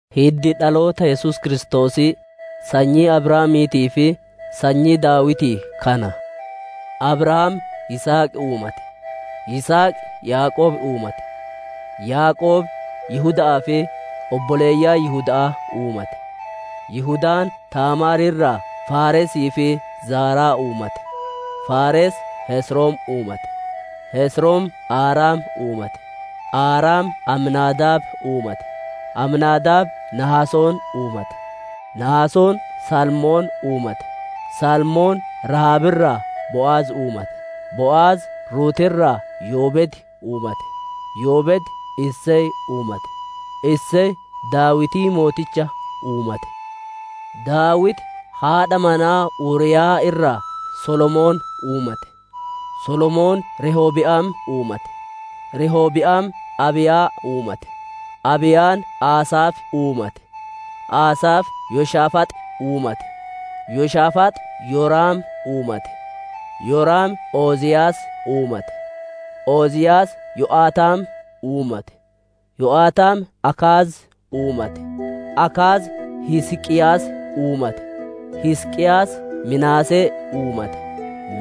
Hiddi dhaloota Yesuus Kiristoosii sanyii Abrahaamiitii fi sanyii Daawitii kana. Abrahaam Yisihaq uumate; Yisihaq Yaaqoob uumate; Yaaqoob Yihuda'aa fi obboleeyyan Yihuda'aa uumate; Yihudaan Taamaar irraa Faaresii fi Zaaraa uumate; Faares Hesrom uumate; Hesrom Aaram uumate; Aaram Aminaadaab uumate; Aminaadaab Nahasoon uumate; Nahasoon Salmoon uumate; Salmoon Rahaab irraa Bo'az uumate; Bo'az Ruuti irraa Yoobeed uumate; Yoobeed Isey uumate; Isey Daawitii mooticha uumate; Daawiti haadha manaa Uriiyaa irraa Solomoon uumate; Solomoon Rehobiyaam uumate; Rehobiyaam Abiiyaa uumate; Abiiyaan Asaafi uumate; Asaafi Yoshaafaax uumate; Yoshaafaax Yoraam uumate; Yoraam Oziyaas uumate; Oziyaas Yo'ataam uumate; Yo'ataam Akaaz uumate; Akaaz Hisqiyaas uumate; Hisqiyaas Minaasee uumate;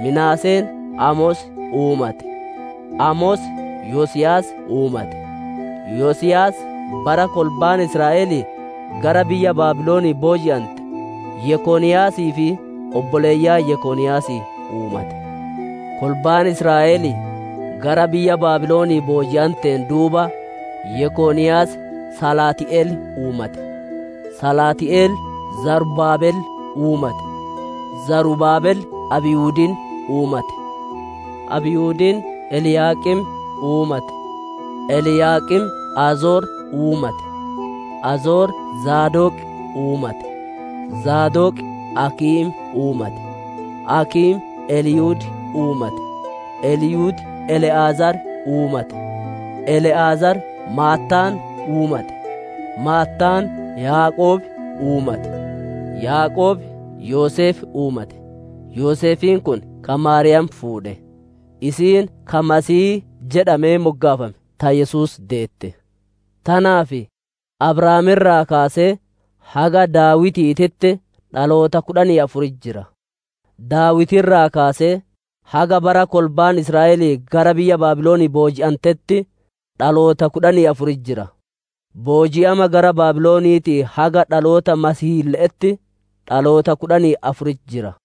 Minaaseen Amos uumate; Amos Yosiyaas uumate; Yosiyaas bara kolbaan Israa'elii gara biyya Baabilonii booji'ante Yekoniyaasii fi obboleeyyan Yekoniyaasii uumate. Kolbaan Israa'elii gara biyya Baabilon booji'anteen duuba Yekoniyaas Salaati'el uumate; Salaati'el Zarubaabel uumate; Zarubaabel Abiyuudin uumate; Abiyuudin Eliyaaqim uumate; Eliyaaqim Azor uumate; Azor Zaadoq uumate; Zaadoq Akiim uumate; Akiim Eliyud uumate; Eliyud Ele'azaar uumate; Ele'azaar Maattaan uumate; Maattaan Yaaqoob uumate; Yaaqoob Yoseef uumate; Yoseefiin kun ka Maariyaam fuudhe; isiin, ka, «Masiihii» jedhamee moggaafame, ta Yesuus deette. Tanaaf Abrahaam irraa kaasee haga Daawitiititti dhaloota kudhanii afuritti jira; Daawiti irraa kaasee haga bara kolbaan Israa'elii gara biyya Baabilonii booji'antetti dhaloota kudhanii afuritti jira; booji'ama gara Baabiloniitii haga dhaloota Masiihiille'etti dhaloota kudhanii afuritti jira.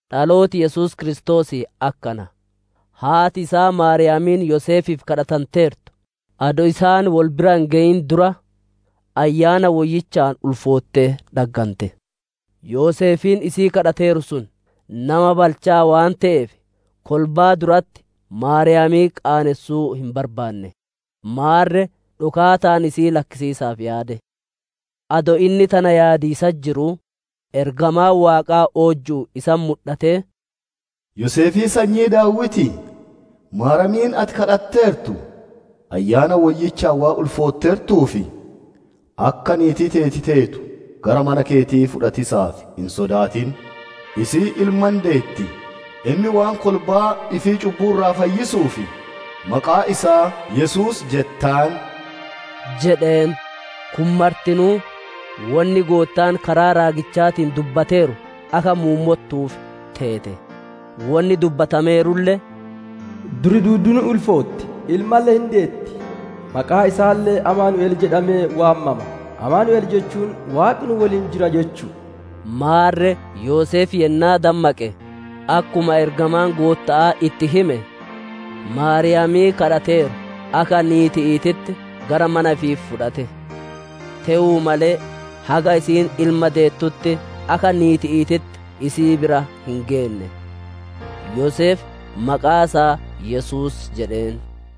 Dhalooti Yesuus Kiristoosii akkana. Haati isaa Maariyaamiin Yoseefiif kadhatanteertu adoo isaan wol bira hin geyin dura, Ayyaana Woyyichaan ulfoottee dhaggante. Yoseefiin isii kadhateeru sun nama balchaa waan te'eef, kolbaa duratti Maariyaamii qaanessuu hin barbaanne; maarre dhokaataan isii lakkisiisaaf yaade. Adoo inni tana yaadiisatti jiruu, ergamaan Waaqaa oojju'uun isatti mudhatee, «Yoseefii sanyii Daawitii! Maariyaamiin ati kadhatteertu, Ayyaana Woyyichaan waan ulfootteertuuf, akka niitii teeti teetu gara mana keetii fudhatiisaaf hin sodaatin. Isiin ilma hin deetti; inni waan kolbaa ifii cubbuu irraa fayyisuuf, maqaa isaa, ‹Yesuus› jettaan» jedheen. Kun martinuu wonni Goottaan karaa raagichaatiin dubbateeru akka muummottuuf teete. Wonni dubbatameerulle, «Durri duudduun hin ulfootti; ilmalle hin deetti; maqaa isaalle, ‹Amaanu'el› jedhamee waamama;» «Amaanu'el» jechuun, «Waaqi nu woliin jira» jechu'u. Maarre Yoseef yennaa dammaqe, akkuma ergamaan Gootta'aa itti hime, Maariyaamii kadhateeru akka niiti'iititti gara mana ifii fudhate. Te'uu malee haga isiin ilma deettutti akka niiti'iititti isii bira hin geenne. Yoseef maqaa isaa Yesuus jedheen.